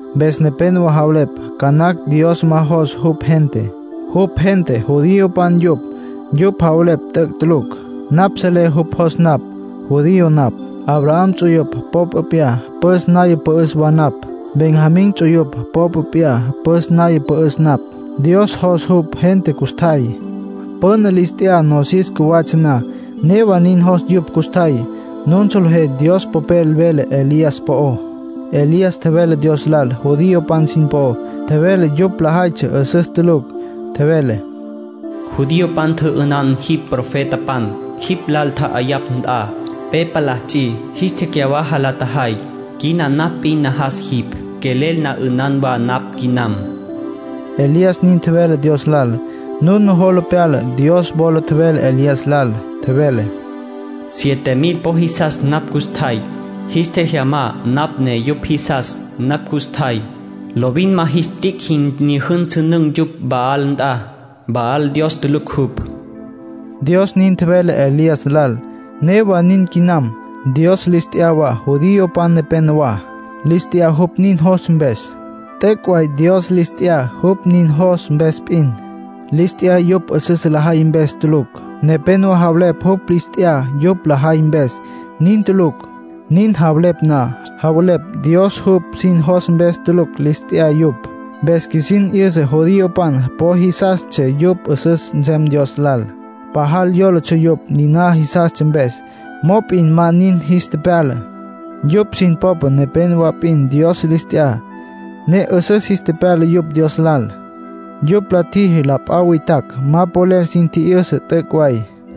Mpes nepénowa javelepj ca nacj Dios ma jos jupj gente. (Jupj gente judiopan yupj.) Yupj javelepj t'üc' tulucj. Napj selé jupj jos napj. Judío napj. Abraham ts'uyupj popa p'iyá püs naya pü'üs wa napj. Benjamín ts'uyupj popa p'iyá püs naya pü'üs napj. Dios jos jupj gente custjay. Püna lis t'ya nosis cjuwatsja na. Newa nin jos yupj custjay. Nun solejé Dios Popel vele Elías po'ó. Elías tjevele Dios lal judiopan sin po'ó. Tjevele yupj lajaytsja 'üsüs tulucj. Tjevele: “Judiopan tjü'ünan jipj profetapan. Jipj lal tja'ayapj nt'a, pe palá ts'i, jis tecyawaja la tjajay. Quina napj p'in najas jipj. Quelel na 'ünan wa napj quinam”, Elías nin tjevele Dios lal. Nun nujola pyala Dios wola tjevele Elías lal. Tjevele: “Siete mil po jisas napj custjay. Jis tjejyamá napj ne yupj jisas napj custjay. Lovin ma jis tic' jin tjijyünsünün̈ yupj Baal nt'a, Baal Dios tulucj jupj”, Dios nin tjevele Elías lal. Newa nin quinam. Dios lis t'ya wa judiopan nepénowa. Lis t'ya jupj nin jostsja mpes. T'üc' way Dios lis t'ya jupj nin jos mpes p'in. Lis t'ya yupj 'üsüs lajay mpes tulucj. Nepénowa javelepj jupj lis t'ya yupj la tjajay mpes. Nin tulucj. Nin javelepj na, javelepj Dios jupj sin jos mpes tulucj lis t'ya yupj. Mpes qjuisin 'yüsa judiopan po jisastsja yupj 'üsüs nsem Dios lal, pajal yólatsja yupj niná jisastsja mpes. Mop'in ma nin jis tepyala. Yupj sin popa nepénowa p'in Dios lis t'ya, ne 'üsüs jis tepyala yupj Dios lal. Jupj la tjiji la p'a witjacj ma polel sin tji'yüsa t'üc' way.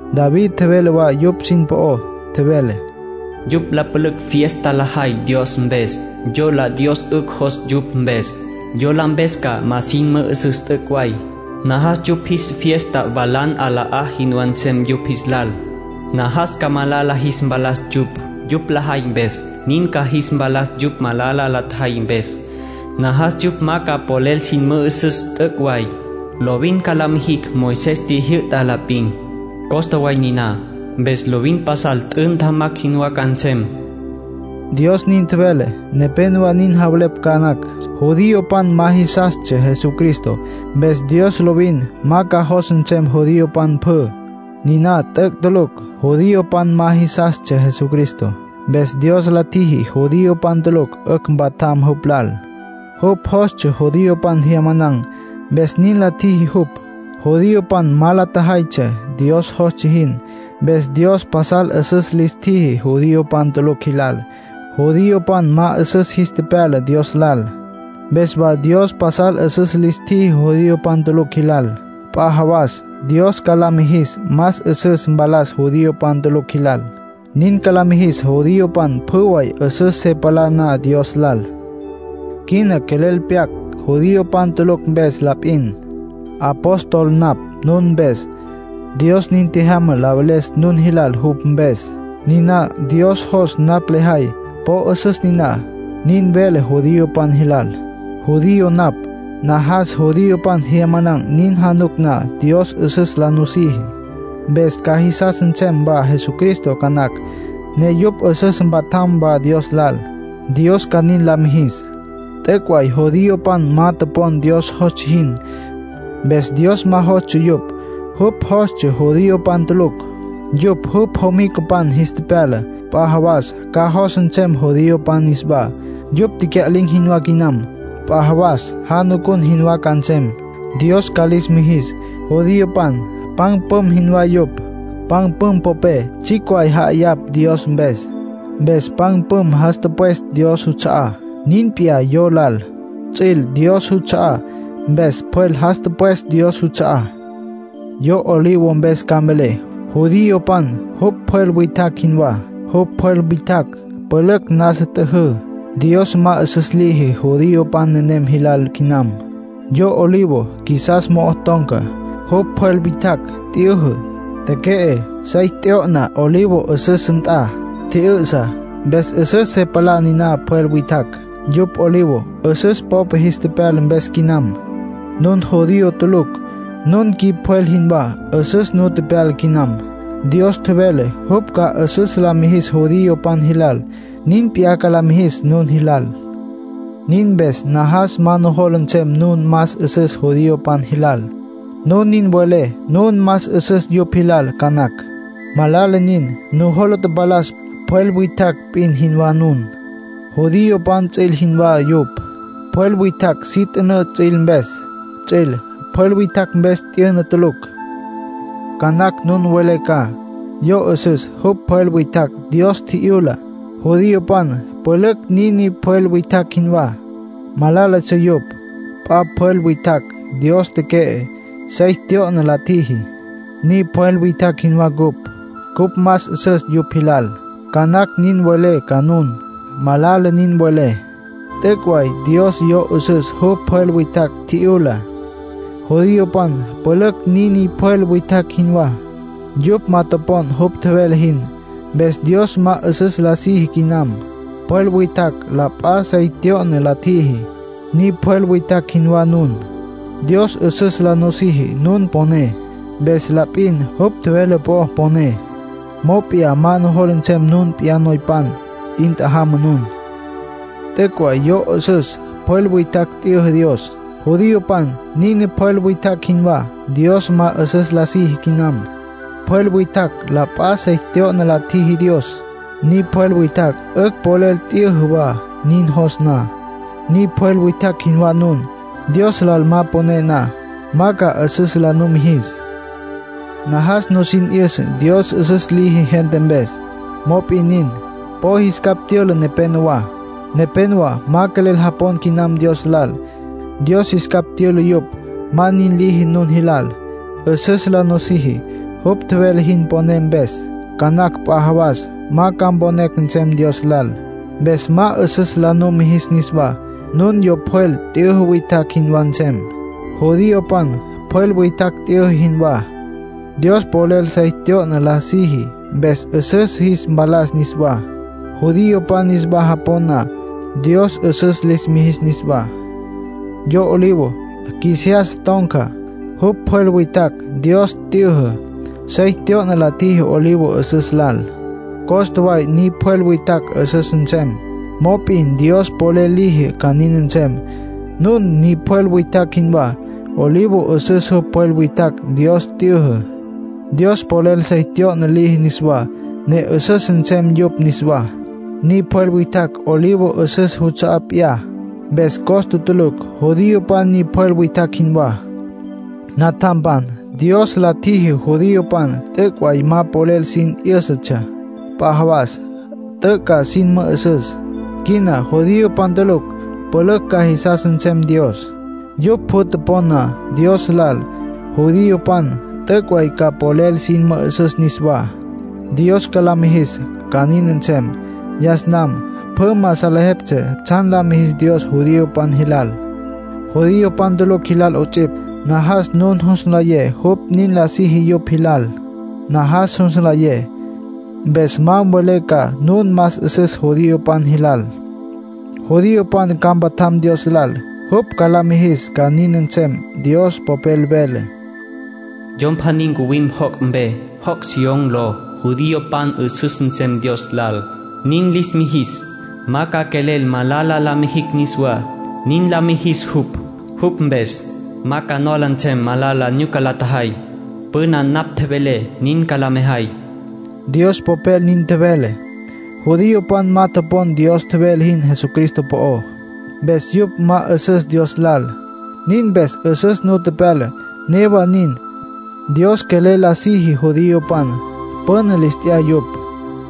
David tjevele wa yupj sin po'ó. Tjevele: “Yupj la pülücj fiesta lajay Dios mpes. Yola Dios 'ücj jos yupj mpes. Yola mpes ca ma sin mü'üsüs t'üc' way. Najas yupj jis fiesta walan 'alama jinwá nsem yupj jis lal. Najas ca malala jis mpalas yupj, yupj lajay mpes. Nin ca jis mpalas yupj malala la tjajay mpes. Najas yupj ma ca polel sin mü'üsüs t'üc' way. Lovin ca la mijicj Moisés tjijyü'tá la p'in. Costa way niná. Mpes lovin pasal t'ü ntjamacj jinwá ca nsem.” Dios nin tjevele. Nepénowa nin javelepj ca nacj, judiopan ma jisastsja Jesucristo, mpes Dios lovin ma ca jos nsem judiopan pjü. Niná t'üc' tulucj. Judiopan ma jisastsja Jesucristo, mpes Dios la tjiji judiopan tulucj 'ücj mpatjam jupj lal. Jupj jostsja judiopan jyamanan̈, mpes nin la tjiji jupj. Judiopan ma la tjajaytsja Dios jostsja jin. Mpes Dios pasal 'üsüs lis tjiji judiopan tulucj jilal. Judiopan ma 'üsüs jis tepyala Dios lal. Mpes wa Dios pasal 'üsüs lis tjiji judiopan tulucj jilal. P'a jawas Dios ca la mijis más 'üsüs mpalas judiopan tulucj jilal. Nin ca la mijis judiopan pjü way 'üsüs se palá na Dios lal. Quina quelel pyac judiopan tulucj mpes la p'in. Apóstol napj nun mpes. Dios nin tjejyama la veles nun jilal jupj mpes. Niná Dios jos napj lejay, po 'üsüs niná. Nin velé judiopan jilal. Judío napj. Najas judiopan jyamanan̈ nin januc na Dios 'üsüs la nusiji. Mpes ca jisas nsem wa Jesucristo ca nacj, ne yupj 'ücj ca mpatjam wa Dios lal, Dios ca nin lis mijis. T'üc' way judiopan ma topon Dios jostsja jin. Mpes Dios ma jostsja yupj. Jupj jostsja judiopan tulucj. Yupj jupj jomicapan jis tepyala. P'a jawas ca jos nsem judiopan niswá. Yupj tecya'lin̈ jinwá quinam. P'a jawas janucun jinwá ca nsem, Dios ca lis mijis. Judiopan pan püm jinwá yupj. Pan püm popé tsjicj way ja'ayapj Dios mpes, mpes pan püm jas tüpwes Dios juts'a'á. Nin p'iyá yo lal. Ts'üil Dios juts'a'á, mpes pjwel jas tüpwes Dios juts'a'á. Yo olivo mpes ca mvelé. Judiopan jupj pjwel witjacj jinwá. Jupj pjwel witjacj pülücj nasa t'yüjü. Dios ma 'üsüs liji judiopan nenem jilal quinam. Yo olivo qjuisiyas mo'o ton̈ca, jupj pjwel witjacj t'yüjü, teque'e, sey tyo'na olivo 'üsüs nt'a, tji'yü'sa. Mpes 'üsüs se palá niná pjwel witjacj, yupj olivo 'üsüs popa jis tepyala mpes quinam. Nun judío tulucj. Nun qjui pjwel jinwá. 'Üsüs nu pyala quinam. Dios tjevele jupj ca 'üsüs la mijis judiopan jilal, nin p'iyá ca la mijis nun jilal. Nin mpes najas ma nujola nsem nun más 'üsüs judiopan jilal. Nun nin welé nun más 'üsüs yupj jilal ca nacj. Malala nin. Nujola tapalas, pjwel witjacj p'in jinwá nun. Judiopan ts'üil jinwá yupj. Pjwel witjacj si t'ünǘ ts'üil mpes. Ts'üil pjwel witjacj mpes t'yüna tulucj. Ca nacj nun mvelé ca: “Yo 'üsüs jupj pjwel witjacj Dios tji'yula. Judiopan pülücj niní pjwel witjacj jinwá. Malálatsja yupj. P'a pjwel witjacj Dios teque'e, sey tyo'na la tjiji. Ni pjwel witjacj jinwá cupj. Cupj más 'üsüs yupj jilal”, ca nacj nin mvelé ca nun. Malala nin welé. T'üc' way Dios yo 'üsüs jupj pjwel witjacj tji'yula. Judiopan pülücj niní pjwel witjacj jinwá. Yupj ma topon jupj tjevele jin, mpes Dios ma 'üsüs la siji quinam. Pjwel witjacj la p'a sey tyo'na la tjiji. Ni pjwel witjacj jinwá nun. Dios 'üsüs la nusiji nun poné mpes la p'in, jupj tjevele po'ó poné. Mop'in ma nujola nsem nun p'iyá noypan. ¡'In tjajama nun! T'üc' way yo 'üsüs pjwel witjacj t'yüjü Dios. Judiopan niní pjwel witjacj jinwá. Dios ma 'üsüs la siji quinam. Pjwel witjacj la p'a sey tyo'na la tjiji Dios. Ni pjwel witjacj 'ücj polel t'yüjü wa nin jos na. Ni pjwel witjacj jinwá nun. Dios lal ma poné na, ma ca 'üsüs la numijis. Najas nusin 'yüsa Dios 'üsüs liji gente mpes. Mop'in nin, po jis capj tyüla nepenowá. Nepénowa ma quelel japon quinam Dios lal. Dios jis capj tyüla yupj. Ma nin liji nun jilal; 'üsüs la nusiji, jupj tjevele jin poné mpes. Ca nacj p'a jawas ma ca mponé nsem Dios lal. Mpes ma 'üsüs la numijis niswá. Nun yo pjwel t'yüjü witjacj jinwá nsem. Judiopan pjwel witjacj t'yüjü jinwá. Dios polel sey tyo'na la siji, mpes 'üsüs jis mpalas niswá. Judiopan niswa japon na, Dios 'üsüs lis mijis niswá. Yo olivo qjuisiyas ton̈ca, jupj pjwel witjacj Dios t'yüjü. Sey tyo'na la tjiji olivo 'üsüs lal. Costa way ni pjwel witjacj 'üsüs nsem; mop'in Dios polel liji ca nin nsem. Nun ni pjwel witjacj jinwá. Olivo 'üsüs jupj pjwel witjacj Dios t'yüjü. Dios polel sey tyo'na liji niswá, ne 'üsüs nsem yupj niswá. Ni pjwel witjacj olivo 'üsüs juts'a'á p'iyá, mpes costa tulucj. Judiopan ni pjwel witjacj jinwá. Natjampan, Dios la tjiji judiopan t'üc' way ma polel sin 'yǘsatsja. P'a jawas t'üc' ca sin mü'üsüs. Quina judiopan tulucj pülücj ca jisas nsem Dios. Yupj pjü topon na Dios lal, judiopan t'üc' way ca polel sin mü'üsüs niswá; Dios ca la mijis ca nin nsem. Yas nam pjü ma salejeptsja tsjan la mijis Dios judiopan jilal, judiopan tulucj jilal 'ots'ipj. Najas nun jus nlayé jupj nin la siji yupj jilal. Najas jus nlayé, mpes ma mvelé ca nun más 'üsüs judiopan jilal. Judiopan ca mpatjam Dios lal, jupj ca lis mijis ca nin nsem. Dios Popel vele: “Yom pjaní ncuwim joc' mpe, joc' Sión ló. Judiopan 'üsüs nsem Dios lal, nin lis mijis. Ma ca quelel malala la mijicj niswá, nin la mijis jupj. Jupj mpes, ma ca nola nsem malala nyuca la tjajay. Püna napj tjevelé nin ca la mejay.” Dios Popel nin tjevele. Judiopan ma topon Dios tjevele jin Jesucristo po'ó. Mpes yupj ma 'üsüs Dios lal. Nin mpes 'üsüs nu tepyala. Newa nin, Dios quelel la siji judiopan; püna lis t'ya yupj.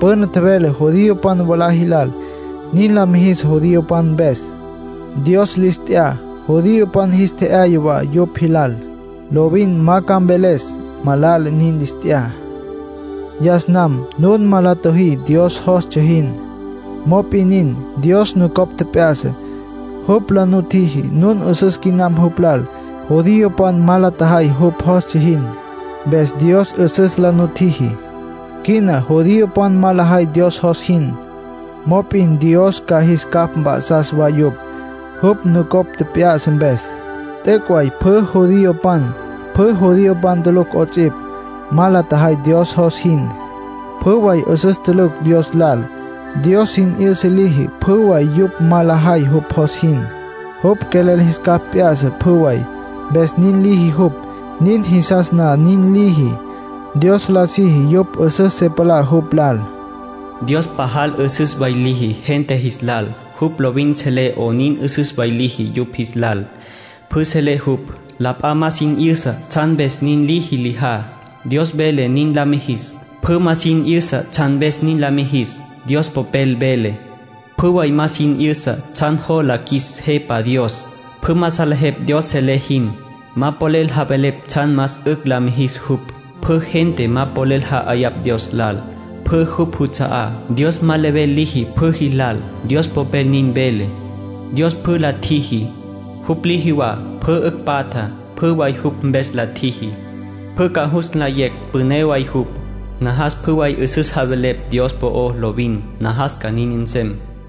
Püna tjevele judiopan mwalá jilal nin la mijis judiopan mpes. Dios lis t'ya judiopan, jis tje'yaya wa yupj jilal. Lovin ma ca mveles malala nin lis t'ya. Yas nam nun ma la tjüjí Dios jostsja jin. Mop'in nin, Dios nucopj tjep'ya'sa; jupj la nutjiji nun 'üsüs quinam jupj lal. Judiopan ma la tjajay jupj jostsja jin, mpes Dios 'üsüs la nutjiji. Quina judiopan ma lajay Dios jos jin. Mop'in Dios ca jis capj mp'a'sas wa yupj, jupj nucopj tjep'ya'sa mpes. T'üc' way pjü judiopan, pjü judiopan tulucj 'ots'ipj, ma la tjajay Dios jos jin. Pjü way 'üsüs tulucj Dios lal. Dios sin 'yüsa liji pjü way yupj ma lajay jupj jos jin. Jupj quelel jis capj p'ya'sa pjü way, mpes nin liji jupj. Nin jisas na nin liji. Dios la siji yupj 'üsüs se palá jupj lal. Dios pajal 'üsüs way liji gente jis lal. Jupj lovin selé 'onin 'üsüs way liji yupj jis lal. Pjü selé jupj. La p'a ma sin 'yüsa tsjan mpes nin liji lijá. Dios vele nin la mijis, pjü ma sin 'yüsa tsjan mpes nin la mijis. Dios Popel vele: “Pjü way ma sin 'yüsa tsjan jola qjuis Jepa Dios. Pjü ma salejepj Dios selé jin. Ma polel javelepj tsjan más 'ücj la mijis jupj. Pjü gente ma polel ja'ayapj Dios lal. Pjü jupj juts'a'á. Dios ma level liji pjü jilal.” Dios Popel nin vele. Dios pjü la tjiji. Jupj liji wa pjü 'ücj patja. Pjü way jupj mpes la tjiji. Pjü ca jus nlayecj püné way jupj. Najas pjü way 'üsüs javelepj Dios po'ó lovin. Najas ca nin nsem.